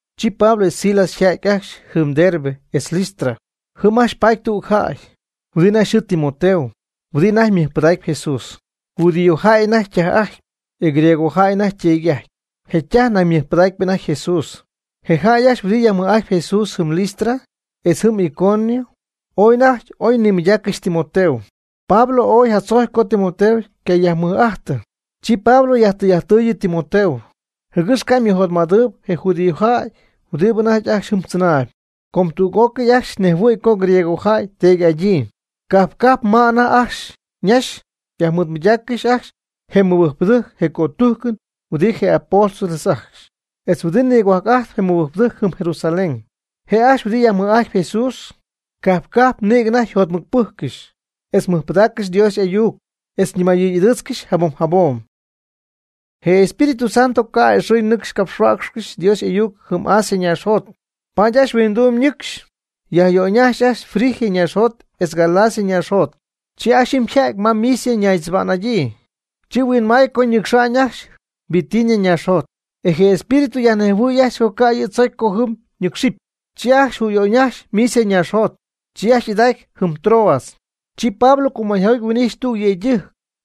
Chi Pablo etz Silas yja'ty ajcxy jɨm Derbe etz Listra. Jɨm ajcxy paty tüg jäy huɨdi anajty yxɨɨ Timoteo huɨdi anajty mɨjpɨdaacp Jesús. Judíojäy anajty ytaj'ajtpy, e griegojäy anajty yteedy'ajtpy. Je' ytaj nañ ymɨbɨjcpy anajty Jesús. Je jäy ajcxy huɨdi yajmɨj'ajtp Jesús jɨm Listra etz jɨm Iconio ooy anajty oy nimɨydaaccɨxy Timoteo. Pablo ooy jatzojcy co Timoteo ycajäymɨɨd'ajtɨ. Chi Pablo yajtɨy'ajttɨɨyɨ Timoteo, jɨgɨx ca' ymɨjotmädɨɨyb je judíojäy huɨdi anajty ajcxy jɨm tzɨnaayb, com tüg'ócɨy ajcxy nejhuɨ̈y co griegojäy teedy'adyii. Cajp cajp ma anajty ajcxy ñaxy yajmɨɨdmɨydaaccɨxy ajcxy je mɨbɨjcpɨdɨjc je cötujcɨn huɨdi je apóstoles ajcxy, etz huɨdi nigohuajc'ajt je mɨbɨjcpɨdɨjc jɨm Jerusalén. Je' ajcxy huɨdi yajmɨj'ajtp Jesús cajp cajp nïgɨ anajty yjotmɨcpɨjccɨxy, etz mɨjpɨdaaccɨxy Dios y'ayuc, etz ñimayɨy'ɨdɨɨtzcɨxy jabom jabom. Je Espíritu Santo ca' a'ɨxɨy nɨcx capxhuäcxcɨxy Dios y'ayuc jɨm Asia ñaaxjot. Paady ajcxy huingduum ñɨcxy yajyöyñajxy ajcxy Frigia ñaaxjot etz Galacia ñaaxjot. Chi ajcxy jɨm yja'ty ma Misia ñaaxtzɨba'n. Chi huinmay co ñɨcxa'ñ ajcxy Bitinia ñaaxjot. E je Espíritu yajnejhuɨɨy ajcxy co ca' yɨ' tzocy co jɨm nɨ́cxcɨxɨpy. Chi ajcxy jüyöyñajxy Misia ñaaxjot, chi ajcxy y'idacy jɨm Troas. Chi Pablo cumäyjoty huin'ijxy tüg yëydɨjc,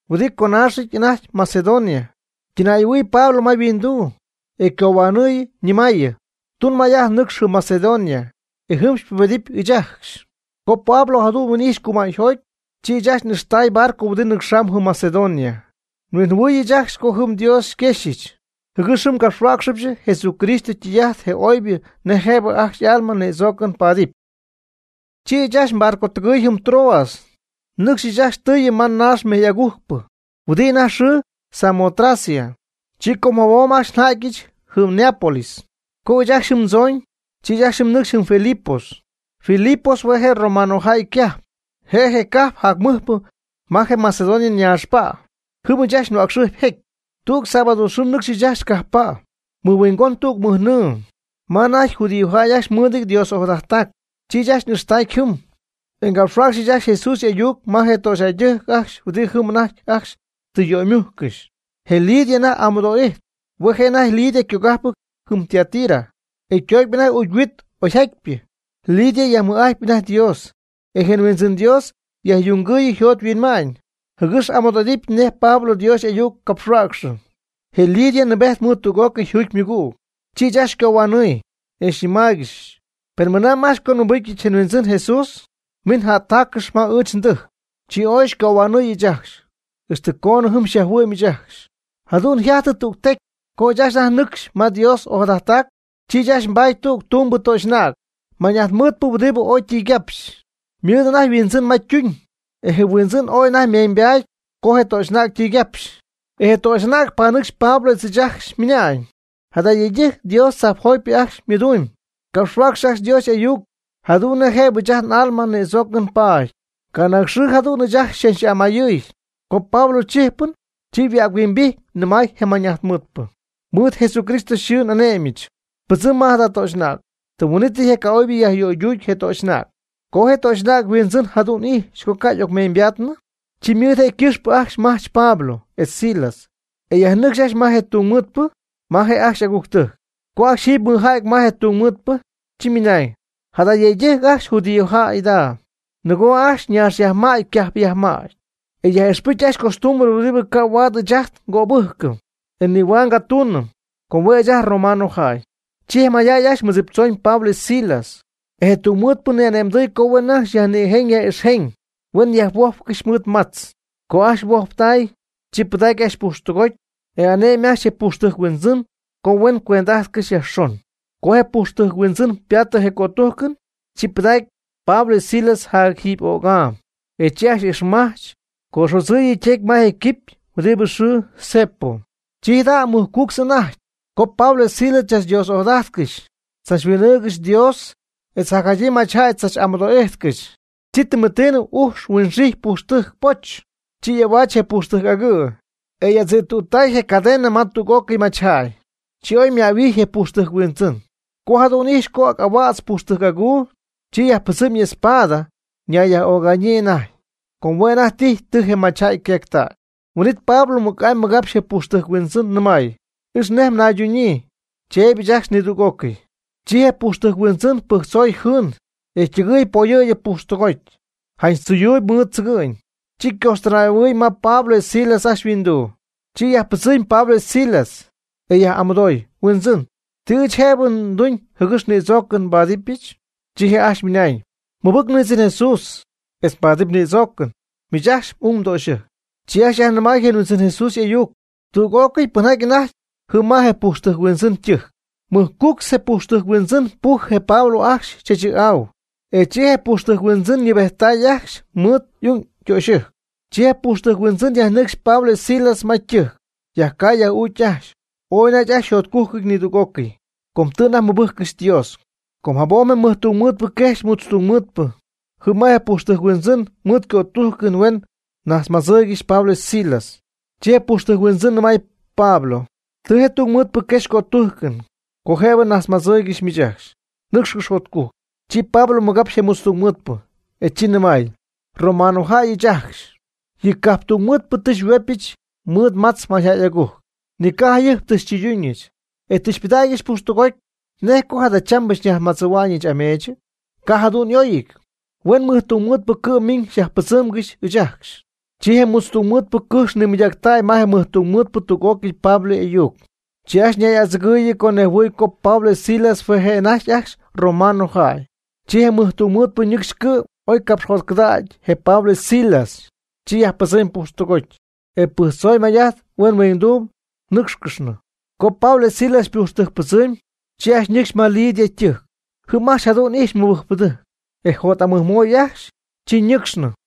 huɨdibɨ yconaaxɨty anajty Macedonia, ytɨnay'ahuɨɨy ma Pablo yhuinduu, e ycohuanɨ̈yii, ñɨmäyii: “Tun may'ajt nɨcx jɨm Macedonia, e jɨm xypubedɨpy ɨɨch ajcxy.” Co Pablo jadu'n huin'ijxy cumäyjoty, chi ɨɨch ajcxy n'ixtay barco huɨdi nɨcxamb jɨm Macedonia. Nhuinjɨhuɨɨy ɨɨch ajcxy co jɨm Dios xyquéjxcɨxyɨch jɨgɨx jɨm ngapxhuäcxɨbɨch Jesucristo ytɨy'ajt je oybɨ nej jëbɨ ajcxy alma nïdzoocɨn paadɨpy. Chi ɨɨch ajcxy nbarcotɨgɨɨy jɨm Troas nɨcxy ɨɨch ajcxy tɨɨyɨ ma naax mejy'agujcpɨ huɨdibɨ anajty yxɨɨ Samotracia. Chi com jabom ajcxy nja'tyɨch jɨm Neápolis. Co ɨɨch ajcxy jɨm ndzooñ, chi ɨɨch ajcxy nɨcxy jɨm Filipos. Filipos hue' je' romanojäy ycajp. Je' je cajp jac mɨjpɨ ma je Macedonia ñaaxpa'. Jɨm ɨɨch ajcxy nhuäcxɨjpy jecy. Tüg sábado nɨcxy ɨɨch ajcxy cajppa', mɨhuingon tüg mɨjnɨɨ, ma anajty judíojäy ajcxy mɨɨdɨty Dios ojadajttac. Chi ɨɨch ajcxy n'ixtacy jɨm, e ngapxhuäcxɨch ajcxy Jesús y'ayuc ma je töxyjäydɨjc ajcxy huɨdi jɨm anajty ajcxy tɨ yöymujccɨxy. Je Lidia anajty y'amɨdo'ijtp. Hue' je' anajty Lidia ycogajpɨty jɨm Tiatira, e ytocpy anajty ucy huit oy jatypɨ. Lidia yajmɨj'ajtpy anajty Dios, e je Huindzɨn Dios yajyungɨɨyɨ yjot yhuinma'ñ, jɨgɨx amɨdo'idɨpy nej Pablo Dios y'ayuc capxhuäcxɨ. Je Lidia nɨɨbejt mɨɨd tüg'ócɨy yjuugy ymɨgüg, chi ɨɨch ajcxy xycohuanɨɨy, e xyñɨmáaygɨxɨch: ―Pen mɨnamb ajcxy co nmɨbɨcyɨch je Huindzɨn Jesús, miin jättaaccɨx ma ɨɨch ndɨjc. Chi ooy xycohuanɨɨy ɨɨch ajcxy, ixtɨ coonɨ jɨm xyajhuɨ'myɨch ajcxy. Jadu'n yjajtɨ tüg tecy co ɨɨch ajcxy anajty ñɨcxy ma Dios ojadajttac, chi ɨɨch ajcxy nbaty tüg tumbɨ töxy'anäg mañ'ajt mɨɨdpɨ huɨdi ooy ytɨygapxy. Ymɨɨd anajty yhuindzɨn ma ytuñ, e je' yhuindzɨn ooy anajty ymeeñybaaty co je töxy'anäg ytɨygapxy. Je töxy'anäg ypanɨcxy chach yam Pablo etz ɨɨch ajcxy ymɨnañ: ―Jada yëydɨjc Dios tzajpjotypɨ ajcxy ymɨdumyb. Capxhuäcxɨ ajcxy Dios y'ayuc jadu'n nej jëbɨ ɨɨch ajt n'alma nïdzoocɨn paady. Canaag xɨɨ jadu'n ɨɨch ajcxy xychach'amayɨɨy. Co Pablo chijpɨn, chi yhuäc-huimbijty nɨmay je mañ'ajtmɨɨdpɨ: ―Mɨɨd Jesucristo yxɨɨ n'ane'myɨch, pɨdzɨm ma jada töxy'anäg. Tɨm huin'ítɨy je ca'oybɨ yajyöyduuty je töxy'anäg. Co je töxy'anäg yhuindzɨn jadu'n ijxy co ca' y'ocmeeñybadaanɨ, chi mɨɨd je' ycɨxpɨ ajcxy majch Pablo etz Silas, e yajnɨcxy ajcxy ma je tungmɨɨdpɨ ma je' ajcxy y'agujctɨjc. Co ajcxy jiiby mɨɨdja'ty ma je tungmɨɨdpɨ, chi ymɨnañ: ―Jada yëydɨjc ajcxy judíojäy jada, nɨgoo ajcxy ñaax yajmäty ycajp yajmäty, etz yaj'ixpɨcy ajcxy costumbre huɨdi ca' huaad ɨɨch ajt ngöbɨjcɨm, e nihuaad ngatuunɨm, com hue' ɨɨch ajt romanojäy. Chi je mayjäy ajcxy mɨɨddziptzoon Pablo etz Silas, e je tungmɨɨdpɨ ni'ane'mdɨy co huen ajcxy yajnïjeñ yaj'ixjeñ huen yajhuojpcɨxy mɨɨd matz. Co ajcxy huojptay, chi pɨdacy ajcxy pujxtɨgoty, e ane'my ajcxy pujxtɨjc huindzɨn co huen cuend'ajtcɨxy yajxon. Co je pujxtɨjc huindzɨn ypaatɨ je cötujcɨn, chi pɨdacy Pablo etz Silas jac jiiby öc'am, e chi ajcxy ixmajch co'adzïty ytecy ma je quipy huɨdi yxɨɨ cepo. Chi jadu'n yjajty mɨjcuctz anajty, co Pablo etz Silas chach Dios ojadajtcɨxy chach huin'ɨɨgɨxy yɨ Dios, e jacjadyii machyjäy chach amɨdoo'ijtcɨxy. Chi tɨmɨtiinɨ ujx huinxijty pujxtɨjc poch. Chi y'ahuaatztay je pujxtɨjc agɨ', e y'adzïttuttay je cadena ma tüg'ócɨy machyjäy. Chi oy ymähuijy je pujxtɨjc huindzɨn. Co jadu'n ijxy ac'ahuädz pujxtɨjc aguu, chi yajpɨdzɨɨmy y'espada ñayyaj'öga'ñyii anajty. Com hue' anajty tijy tɨ je machyjäy yqueectäy. Huin'it Pablo mɨc'amy mɨgapxy je pujxtɨjc huindzɨn nɨmay: ―Ix nej mnayduunɨ, cheeby ajcxy nidüg'ócɨy. Chi je pujxtɨjc huindzɨn pɨjctzoy jɨɨn, e ytɨgɨɨy poyɨ̈gy pujxtɨgoty, janch tzɨyuuyb mɨɨd tzɨgɨ'ñ. Chi ycoxtɨnay'ahuɨɨy ma Pablo etz Silas ajcxy yhuinduu. Chi yajpɨdzɨmy Pablo etz Silas, e yaj'amɨdooy: ―Huindzɨn, ¿ti ɨɨch jëbɨ nduñ jɨgɨx nïdzoocɨn nbáadɨbɨch? Chi je' ajcxy mɨnañ: ―Mɨbɨc Huindzɨn Jesús etz mbaadɨpy nïdzoocɨn, miich etz m'ungdöxyɨjc. Chi ajcxy yajnɨmay je Huindzɨn Jesús y'ayuc tüg'ócɨy pɨnjaty anajty jɨm ma je pujxtɨjc huindzɨn ytɨjc. Mɨjcuctz je pujxtɨjc huindzɨn pujɨ je Pablo ajcxy chaachɨ̈'au, e chi je pujxtɨjc huindzɨn ñɨɨbejttay ajcxy mɨɨd y'ung ytöxyɨjc. Chi je pujxtɨjc huindzɨn yajnɨcxy Pablo etz Silas ma ytɨjc, yajcaay yaj'uucy ajcxy. Ooy anajty ajcxy yjotcujcɨty nidüg'ócɨy, com tɨ anajty mɨbɨjccɨxy Dios. Com jabom je mɨjtungmɨɨdpɨ quejxy mutztungmɨɨdpɨ jɨm ma pujxtɨjc huindzɨn mɨɨd cötujcɨn huen najtzmadzɨɨygɨxy Pablo etz Silas. Chi je pujxtɨjc huindzɨn nɨmay Pablo: ―Tɨ je tungmɨɨdpɨ quexy cötujcɨn co jëbɨ nnajtzmadzɨ̈yɨch miich ajcxy. Nɨcxcɨx jotcujc. Chi Pablo mɨgapxy je mutztungmɨɨdpɨ, e chi nɨmay: ―Romanojäy ɨɨch ajcxy. Yɨ cajptungmɨɨdpɨ tɨ xyhuopyɨch mɨɨd matz mayjäy agujc, ni ca' jayɨjp tɨ xytɨyduñɨch, e tɨ xypɨdägyɨch pujxtɨgoty. ¿Nej co jadachambɨ xyñajtzmadzɨ̈hua'ñɨch ameechɨ? Ca' jadu'n y'óyɨty. Huen mɨjtungmɨɨdpɨ cɨ'm miiñ xyajpɨdzɨ́mgɨxɨch ɨɨch ajcxy. Chi je mutztungmɨɨdpɨ cɨjx nimɨydactäy ma mɨjtungmɨɨdpɨ tüg'ócɨy Pablo y'ayuc. Chi ajcxy ñay'adzɨgɨɨyɨ co nejhuɨɨy co Pablo etz Silas hue' je' anajty ajcxy romanojäy. Chi je mɨjtungmɨɨdpɨ ñɨcxy cɨ'm oy capxjotcɨdägy je Pablo etz Silas. Chi yajpɨdzɨmy pujxtɨgoty, e pɨjctzoy may'ajt huen huingduum nɨ́cxcɨxnɨ. Co Pablo etz Silas ypujxtɨjcpɨdzɨɨmy, chi ajcxy ñɨcxy ma Lidia ytɨjc. Jɨm ajcxy jadu'n ijxy mɨbɨjcpɨdɨjc, e jot'amɨjmoy ajcxy. Chi ñɨ́cxcɨxnɨ.